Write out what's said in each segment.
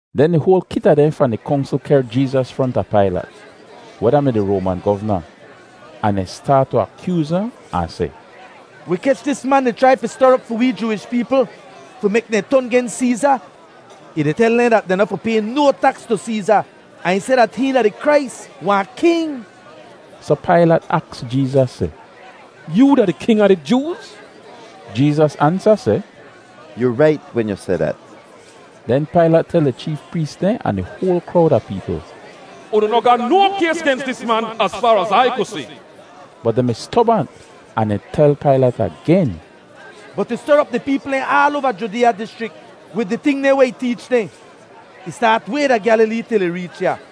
Den di hoal kit a dehn fahn di Kongsl kehr Jeezas fronta Pailat, weh da-mi di Roaman govna. Ahn dehn staat tu akyooz ahn, ahn seh, “Wi kech dis man di chrai fi ster op fi wee Jooish peepl fi mek dehn ton gens Seeza. Ih di tel dehn dat dehn noh fi pay no taks tu Seeza, ahn ih seh dat hihn da di Krais, wahn king!” Soh Pailat aks Jeezas seh, “Yoo da di king a di Jooz?” Jeezas ansa seh, “Yu rait wen yu seh dat.” Den Pailat tel di cheef prees dehn ahn di hoal krowd a peepl, “Unu noh ga no kays gens dis man az faar az Ai ku si.” Bot dehn mi stobant ahn dehn tel Pailat agen, “Bot ih ster op di peepl dehn aal oava Judeeya dischrik wid di ting dehn weh ih teech dehn. Ih staat way da Gyalilee til ih reech ya.”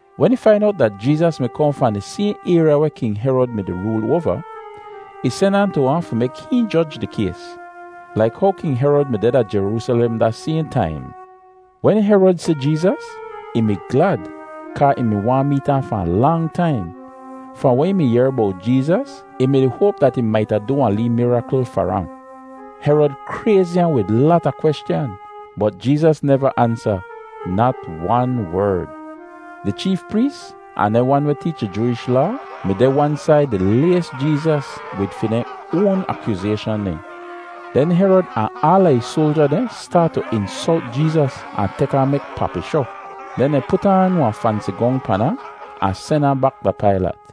Wen ih fain owt dat Jeezas mi kohn fahn di sayhn ayrya weh King Herod mi-di rool oava, ih sen ahn tu ahn fi mek hihn joj di kays, laik how King Herod mi deh da Jeroosalem da sayhn taim. Wen Herod si Jeezas, ih mi glad kaa ih mi waahn meet ahn fahn lang taim. Fahn weh ih mi yehr bowt Jeezas, ih mi-di hoap dat ih maita du wahn lee mirakl far ahn. Herod krayzi ahn wid lata kweschan, bot Jeezas neva ansa nat wan werd. Di cheef prees ahn dehn wan weh teech di Jooish Laa mi deh wan said di lays Jeezas wid fi dehn oan akyoozayshan dehn. Den Herod ahn aala ih soalja dehn staat tu insolt Jeezas ahn tek ahn mek papishoh. Den dehn put aan wahn fansi gong pan ahn, ahn sen ahn bak da Pailat.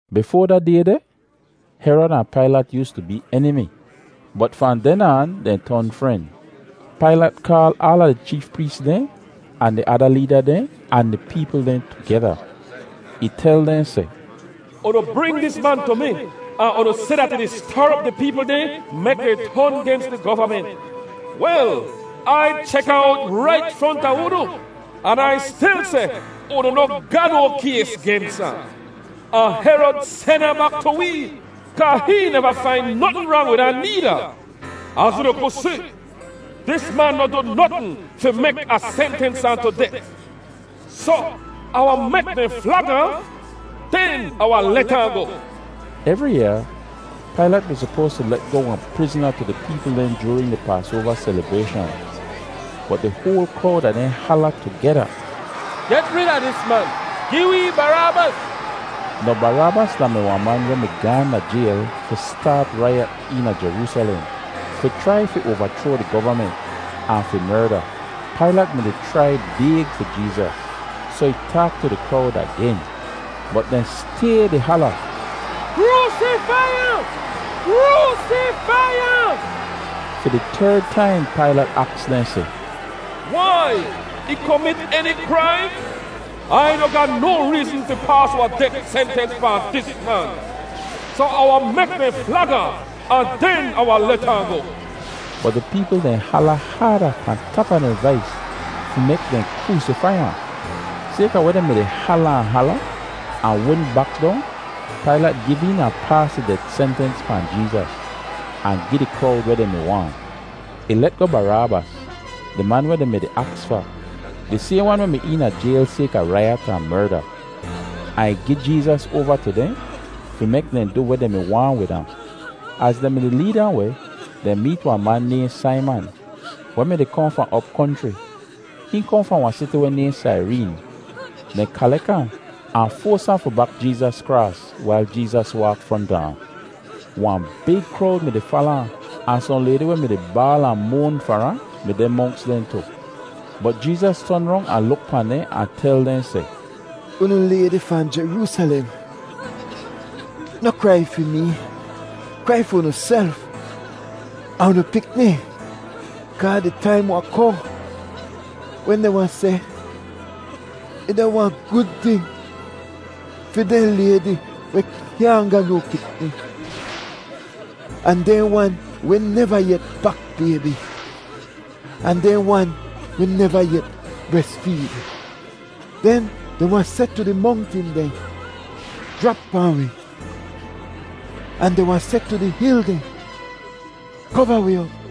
Bifoa da day deh, Herod ahn Pailat yoostu bee enimi, bot fahn den aan dehn ton fren. Pailat kaal aala di cheef prees dehn ahn di ada leeda dehn ahn di peepl dehn tugeda. Ih tel dehn seh, “Unu bring dis man tu mi ahn unu seh dat ih di ster op di peepl dehn mek dehn ton gens di govament. Wel, Ai chek ahn owt rait fronta unu, an Ai stil seh unu noh ga no kays gens ahn. Ahn Herod sen ahn bak tu wee, kaa hihn neva fain notn rang wid ahn needa. Az unu ku si, dis man noh du notn fi mek Ah sentens ahn tu det. Soh, Ah wahn mek dehn flag ahn, den Ah wahn let ahn goh.” [Evri yaa Pailat mi sopoas tu let goh wahn prizna tu di peepl dehn joorin di Paasoava selibrayshan.] Bot di hoal krowd a dehn hala tugeda, “Get rid a dis man! Gi wee Baraabas!” (Now Baraabas da-mi wahn man weh mi gaahn da jayl fi staat raiyat eena Jeroosalem fi chrai fi oavachroa di govament, ahn fi merda.) Pailat mi-di chrai bayg fi Jeezas, soh ih taak tu di krowd agen. Bot dehn stay di hala, “Kroosifai ahn! Kroosifai ahn!” Fi di terd taim Pailat aks dehn seh, “Wai? Ih komit eni kraim? Ai noh ga no reezn fi paas wahn det sentens pahn dis man. Soh Ah wahn mek dehn flag ahn, ahn den Ah wahn let ahn goh.” Bot di peepl dehn hala haada pahn tap a dehn vais fi mek dehn kroosifai ahn. Sayka weh dehn mi-di hala ahn hala ahn wudn bak dong, Pailat giv een ahn paas di det sentens pahn Jeezas, ahn gi di krowd weh dehn mi waahn. Ih let goh Baraabas, di man weh dehn mi-di aks fa, di sayhn wan weh mi eena jayl sayka raiyat ahn merda, ahn ih gi Jeezas oava tu dehn fi mek dehn du weh dehn mi waahn wid ahn. Az dehn mi-di leed ahn weh, dehn meet wahn man nayhn Saiman weh mi-di kohn fahn op konchri. Hihn kohn fahn wahn siti weh nayhn Saireen. Dehn kalek ahn, ahn foas ahn fi bak Jeezas kraas wail Jeezas waak fronta ahn. Wahn big krowd mi-di fala ahn, ahn sohn laydi weh mi-di baal ahn moan far ahn mi deh monks dehn tu. Bot Jeezas ton rong ahn luk pahn dehn ahn tel dehn seh, “Unu laydi fahn Jeroosalem, noh krai fi mee; krai fi unuself ahn unu pikni. Kaa di taim wahn kohn wen dehn wahn seh, ‘Ih da wahn gud ting fi dehn laydi weh kyaahn ga no pikni, ahn dehn wan weh neva yet bak baybi, ahn dehn wan weh neva yet bresfeed.’ Den dehn wahn seh tu di mongtin dehn, ‘Jrap pahn wi!’ Ahn dehn wahn seh tu di hil dehn, ‘Kova wi op!’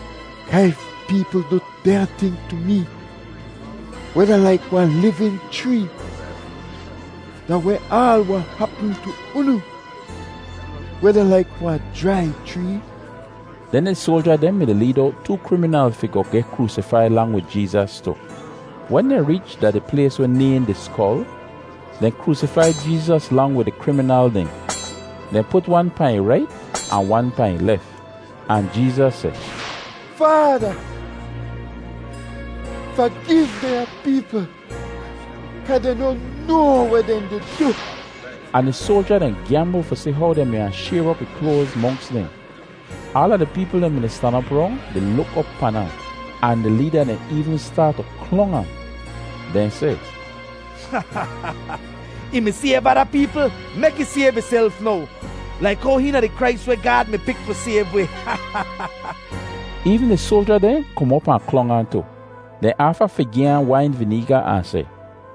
Kaa if peepl du dehnya ting tu mee weh da laik wahn livin chree, da weh aal wahn hapm tu unu, weh da laik wahn jrai chree?” Den di soalja dehn mi-di leed owt too kriminal fi goh geh kroosifai lang wid Jeezas tu. Wen dehn reech da di plays weh nayhn “Di Skol,” dehn kroosifai Jeezas lang wid di kriminal dehn. Dehn put wan pahn ih rait ahn wan pahn ih lef. Ahn Jeezas seh, “Faada, fagiv dehnya peepl kaa dehn noh noa weh dehn di du.” Ahn di soalja dehn gyambl fi si how dehn mi wahn shayr op ih kloaz monks dehn. Aala di peepl dehn mi-di stan op rong di luk op pan ahn, ahn di leeda dehn eevn staat tu klong ahn. Dehn seh, “Ih mi sayv ada peepl; mek ih sayv ihself now, laik how hihn da di Krais weh Gaad mi pik fi sayv wi.” Eevn di soalja dehn kom op ahn klong ahn tu. Dehn aafa fi gi ahn wain vineega ahn seh,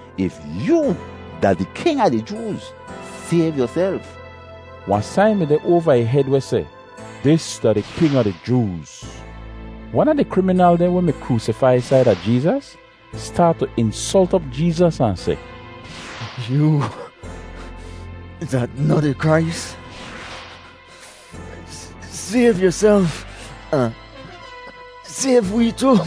“If yoo da di king a di Jooz, sayv yuself.” Wahn sain mi deh oava ih hed weh seh: DIS DA DI KING A DI JOOZ. Wan a di kriminal dehn weh mi kroosifai saida Jeezas, staat tu insolt op Jeezas ahn seh, “Yoo da noh di Krais? Sayv yuself ahn sayv wee tu.”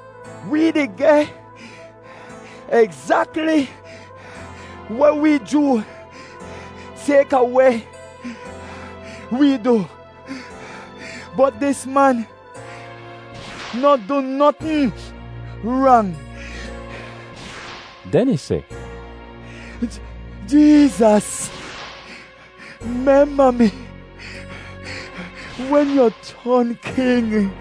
Wee di geh egzakli weh wee joo sayka weh wee du, bot dis man noh du notn rang.” Den ih seh, “Jeezas, memba mi wen yu ton King.”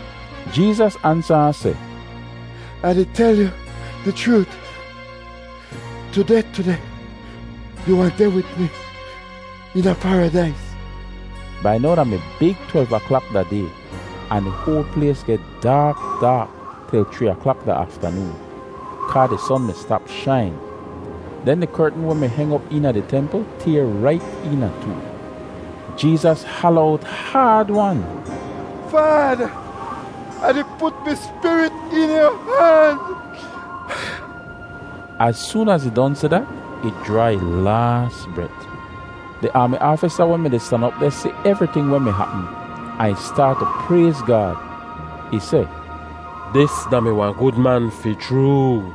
Jeezas ansa ahn seh, “Ah di tel yu di chroot, tudeh tudeh yu wahn deh wid mi eena Paradais.” Bai now da mi big twelv aklak da day, ahn di hoal plays geh daak daak til chree aklak da aftanoon, kaa di son mi stap shain. Den di kertn weh mi heng op eena di templ tayr rait eena too. Jeezas hala owt haad-wan, “Faada, Ah di put mi spirit eena yu han.” Az soon az ih don seh dat, ih jraa ih laas bret. Di aami aafisa weh mi-di stan op deh si evriting weh mi hapm, ahn ih staat tu prayz Gaad. Ih seh, “Dis da-mi wahn gud man fi chroo.”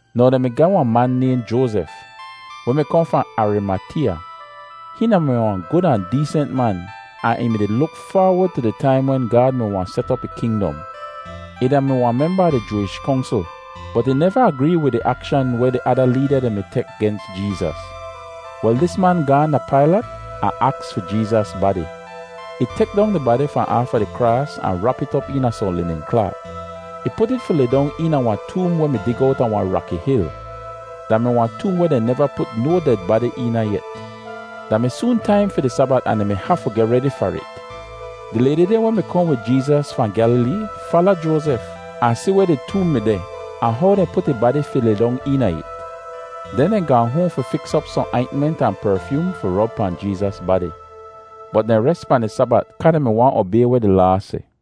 Now dehn mi ga wahn man nayhn Joazef, weh mi kohn fahn Arimateeya. Hihn da-mi wahn gud ahn deesent man ahn ih mi-di luk faawod tu di taim wen Gaad mi wahn set op ih kingdom. Ih da-mi wahn memba a di Jooish Kongsl, bot ih neva agree wid di akshan weh di ada leeda dehn mi tek gens Jeezas. Wel, dis man gaahn da Pailat ahn aks fi Jeezas badi. Ih tek dong di badi fahn aafa di kraas ahn rap it op eena sohn linin klaat. Ih put it fi lidong eena wahn toom weh mi dig owta wahn raki hil. Da mi wahn toom weh dehn neva put no ded badi eena yet. Da mi soon taim fi di Sabat ahn dehn mi hafu geh redi far it. Di laydi dehn weh mi kohn wid Jeezas fahn Gyalilee fala Joazef ahn si weh di toom mi deh ahn how dehn put ih badi fi lidong eena it. Den dehn gaahn hoahn fi fiks op sohn aintment ahn perfyoom fi rob pahn Jeezas badi. Bot dehn res pahn di Sabat kaa dehn mi waahn obay weh di Laa seh.